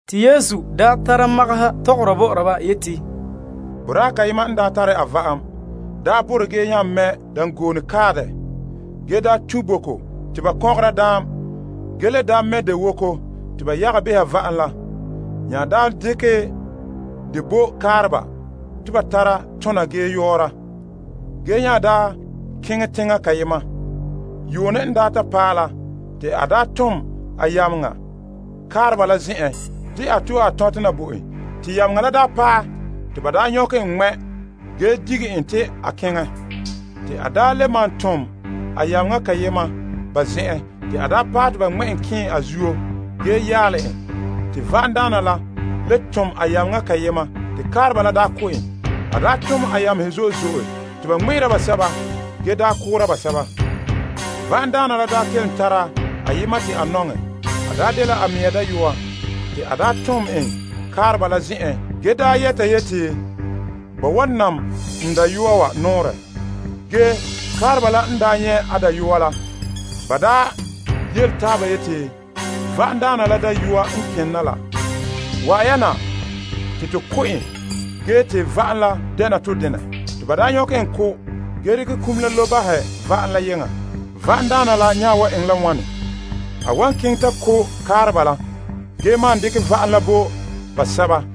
Yesu daa nya tara magaha tɔgɔra bɔ'ɔra ba. A yeti, Boraa kayema n daa tare a va'am, daa borɛ ge nya mɛ' dangoone kae dɛ. Ge a daa tun' boko te ba ŋmɛkera daam ge le daa mɛ' dewoko te ba yaga behɛ va'am la. A mya daa dekɛ dɛ bo kaareba te ba tara tona ge yɔɔra, ge nya daa keŋɛ teŋa kayema. Yuune n daa paɛ la te a daa tom a yameŋa kaareba la zen'en, te a to'e a tɔntɛ na bo en. Te yameŋa la daa paɛ te ba daa nyɔkɛ en ŋmɛ' ge digɛ en ta keŋɛ. Te a daa le malom tom a yameŋa kayema ba zen'en te a paɛ te ba ŋmɛ' en kɛɛn a zuo ge yaalɛ en. Te va'amdaana la le tom a yameŋa kayema te kaareba la daa ko' en. N daa tone a yamehe zo'e zo'e, te ba daa ŋmɛ'ɛre basɛba la ge daa ko' basɛba. Va'amdaana la daa kelom tara ayema te a nɔŋɛ. A daa dela a mɛŋa dayɔa. Te a daa tom en kaareba la zen'en ge daa yɛta yeti, Ba wan nam n dayɔa wa nɔɔrɛ. Ge kaareba la n daa nyɛ' a dayɔa la, ba daa yele taaba yeti, Va'amdaana la dayɔa n kena la. Wa'an ya na te to ko' en ge te va'am la dɛna to denɛ. Te ba daa nyɔkɛ en ko' ge dekɛ iŋa la lobe bahɛ va'am la yeŋa. Va'amdaana la nya wan eŋɛ la wane? A wan keŋɛ ta ko' kaareba la ge maan dekɛ va'am la bo basɛba.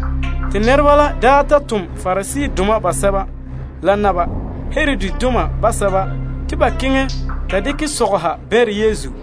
Te ba le tom Pariseedoma basɛba la Herodidoma basɛba te ba daa keŋɛ ta dekɛ sɔgɔha bɛnrɛ Yesu.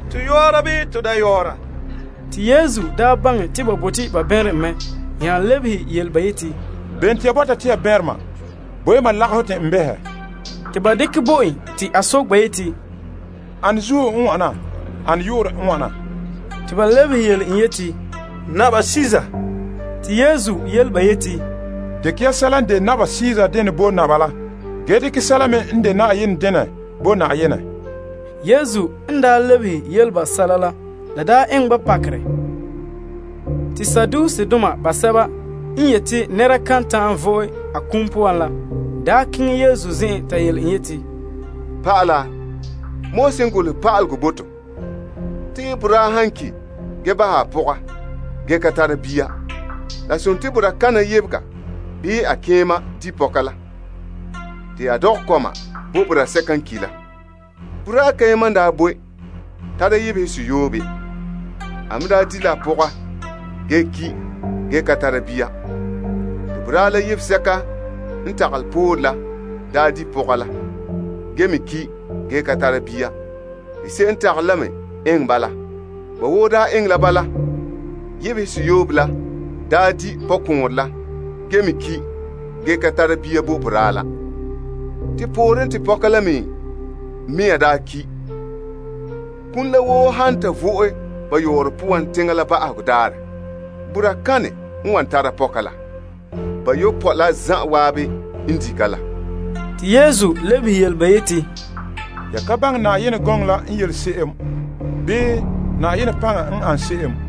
To yɔɔra bii to da yɔɔra? Ge Yesu baŋɛ te ba bote ba bɛnrɛ en mɛ nya lebehe ba yeti, Bene te ya bɔta te ya bɛnrɛ mam? Bo' ya mam lagahɔ te n behɛ. Te ba dekɛ bo en, te a soke ba yeti, Ane zuo n wana? Ane yu'urɛ n wana? Te ba lebehe en yeti, Kaesar. Yesu nya yele ba yeti, Dekɛ ya sɛla n de Kaesar dene bo Kaesar la, ge dekɛ sɛla me n de Yenɛ dene bo Yenɛ. Yesu n lebehe yele ba sɛla la, la daa eŋɛ ba pakerɛ. Te Saduseedoma sɛba n yeti te nɛreba kan ta'an vo'e ba kum poan la, daa keŋɛ Yesu zen'en ta soke en sɛla. Ba yeti, Pa'ala, Moses n golehɛ bo to, te boraa han ki' ge bahɛ a pɔga ge ka tara bia, la dela boraa kana sɔɔn to'e en di' pɔka la, te a dɔgɛ kɔma bo boraa sɛka n ki' la. Boraa kayema n daa boe tara yebehe seyoobe. A me daa di' la a pɔga ge ki' ge ka tara bia. Te boraa la yebega sɛka n tagalɛ poore la daa di' a pɔga la, ge me ki' ge ka tara bia. Te se'em n tagalɛ la me eŋɛ bala. Ba woo daa eŋɛ la bala. Bayopɔe la zan'an la daa di' pɔka la ge me ki' ge ka tara bia bo boraa la. Te pooren, te pɔka la mea me daa ki'. Tɔ. Kum la woo han ta vo'e ba yɔɔrɔ poan teŋa la ba'ahegɔ daarɛ, boraa kane n wan tara pɔka la? Bayopɔe la zan'an n di' ka la. Te Yesu lebehe yele ba yeti, Ya ka baŋɛ Yenɛ gɔŋɔ la n yele se'em bii Na'ayenɛ paŋa n ane se'em?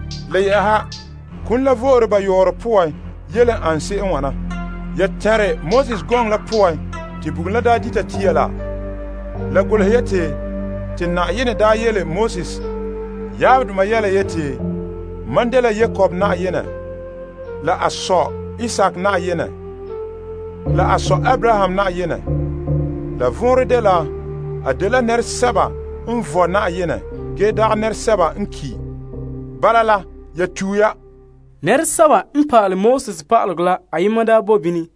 Le yɛ'ɛha kum la vo'ore ba yɔɔrɔ poan yele an se'em wana. Ya tɛnrɛ Moses gɔŋɔ la poan te bugum la n daa dita tuntuo la? La golehɛ yeti te Yenɛ yele en yeti, Mam n de Abraham Yenɛ la Isaak Yenɛ la Yakob Yenɛ. La vɔnrɛ dela, a dela nɛresɛba n vɔe Yenɛ ge dagɛ nɛresɛba n ki'. Bala la, ya tue ya. Pa'alegɔ pa'ala ayema daa bo bini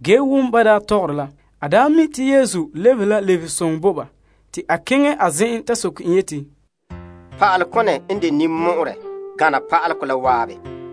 ge wom ban daa tɔgɔre la. A daa mi' te Yesu daa lebehe la lebehesoŋɔ bo ba, te a soke en yeti, Pa'alekone n de ninmɔ'ɔrɛ gana pa'alegɔ la zan'an?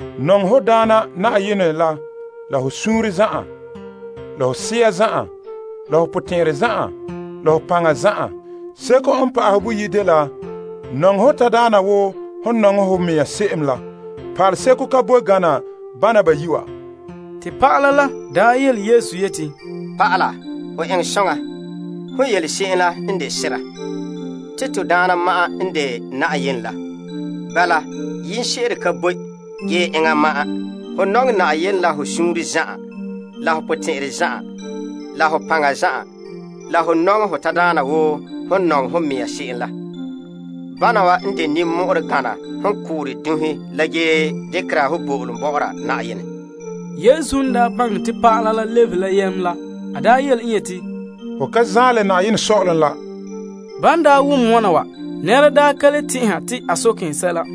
Nɔŋɛ Na'ayenɛ ho Yenɛ la la ho suunre zan'an la ho sea zan'an la ho paŋa zan'an. Seko n pa'ahɛ boyi' la dela: Nɔŋɛ ho tadaana wo hom n nɔŋɛ ho mɛŋa se'em la. Pa'aleseko ka boe gana bana bayi' wa. Te pa'ala la yele Yesu yeti, Pa'ala, ho eŋɛ soŋa. Hon yele se'em la n de sera, te Na'ayenɛ ma'an n de Yenɛ la ge se'em ka le bɔna pa'ahɛ. Nɔŋɛ Na'ayenɛ ho Yenɛ la la ho suunre zan'an, la ho sea zan'an, la ho paŋa zan'an. la ho nɔŋɛ ho tadaana wo hom n nɔŋɛ ho mɛŋa se'em la. Bana wa n de ninmɔ'ɔrɛ gana hon koora dunhe la ge dekera bo'olom bɔ'ɔra Na'ayenɛ. Yesu n baŋɛ te pa'ala la lebehe la yam, a yele ba yeti, Ho ka zaen la Yenɛ sɔ'ɔlom la. Ban daa wom wana wa, nɛnɛra daa ka le tɛn'ɛha te a soke en sɛla.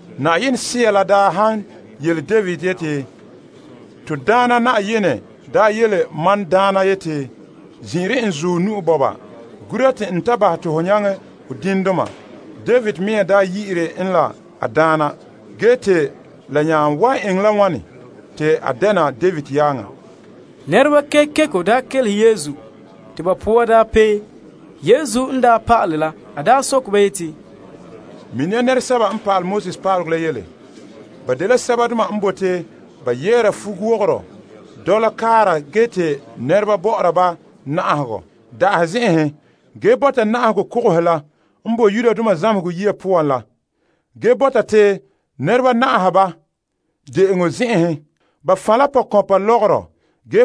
Na'ayenɛ Sea la daa bahɛ te David yeti, Na'ayenɛ yele mam Daana la yeti, zin'ire n zuɔ nu'o wa na, gura te n bahɛ te ho diŋdoma lebege ho tagatɛ. David mea daa yi'ire en la a Daana, ge te la nya wan eŋɛ la wane, te a dɛna David yaaŋa? Nɛreba kekeko daa kelehe Yesu te ba poa daa pee. Yesu n daa pa'ala la, a yele ba yeti, Mini ya pa'alegɔ pa'aleba la yele. Ba bote ba yɛɛra fuwogorɔ dɔla kaara ge te nɛreba bɔ'ɔra ba na'ahegɔ da'ahe zen'enhen, ge ba bɔta na'ahegɔ kogohe la n bo zamehegɔ yiya poan la, ge ba bɔta te nɛreba na'aha ba de'enɔ zen'enhen. Ba fan' la pɔkɔnpa lɔgɔrɔ ge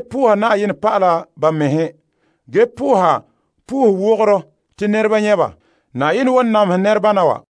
soha sohowogoro te nɛreba nyɛ' ba. Na'ayenɛ wan namehɛ nɛrebana wa la namehegɔ.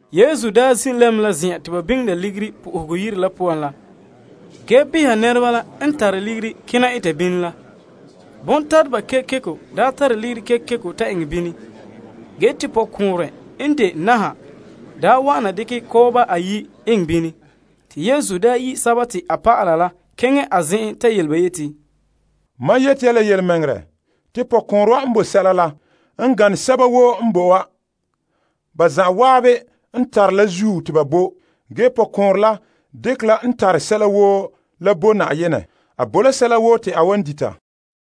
Yesu daa zin' lɛm la zen'an te ba biŋera ligiri Yenɛ Yire la poan la ge bɛha nɛreba la n tare ligiri kena eta bini la. Bontateba kekeko daa tare ligiri kekeko ta eŋɛ bini. Ge te pɔkɔɔnrɛ n de naha daa wa'ana dekɛ kɔba ayi' na eŋɛ bini. Yesu yi' a dɔlɔba la keŋɛ a zen'en ta yele ba yeti, Mam yeti ya la yelemɛŋɛrɛ, te pɔkɔɔnrɛ wa n bo sɛla n gane sɛba woo n bo wa. Ba zan'an n tare la zuo te ba bo, ge pɔkɔɔnrɛ la dekɛ la n tare sɛla woo la bo Na'ayenɛ, sɛla te a wan dita.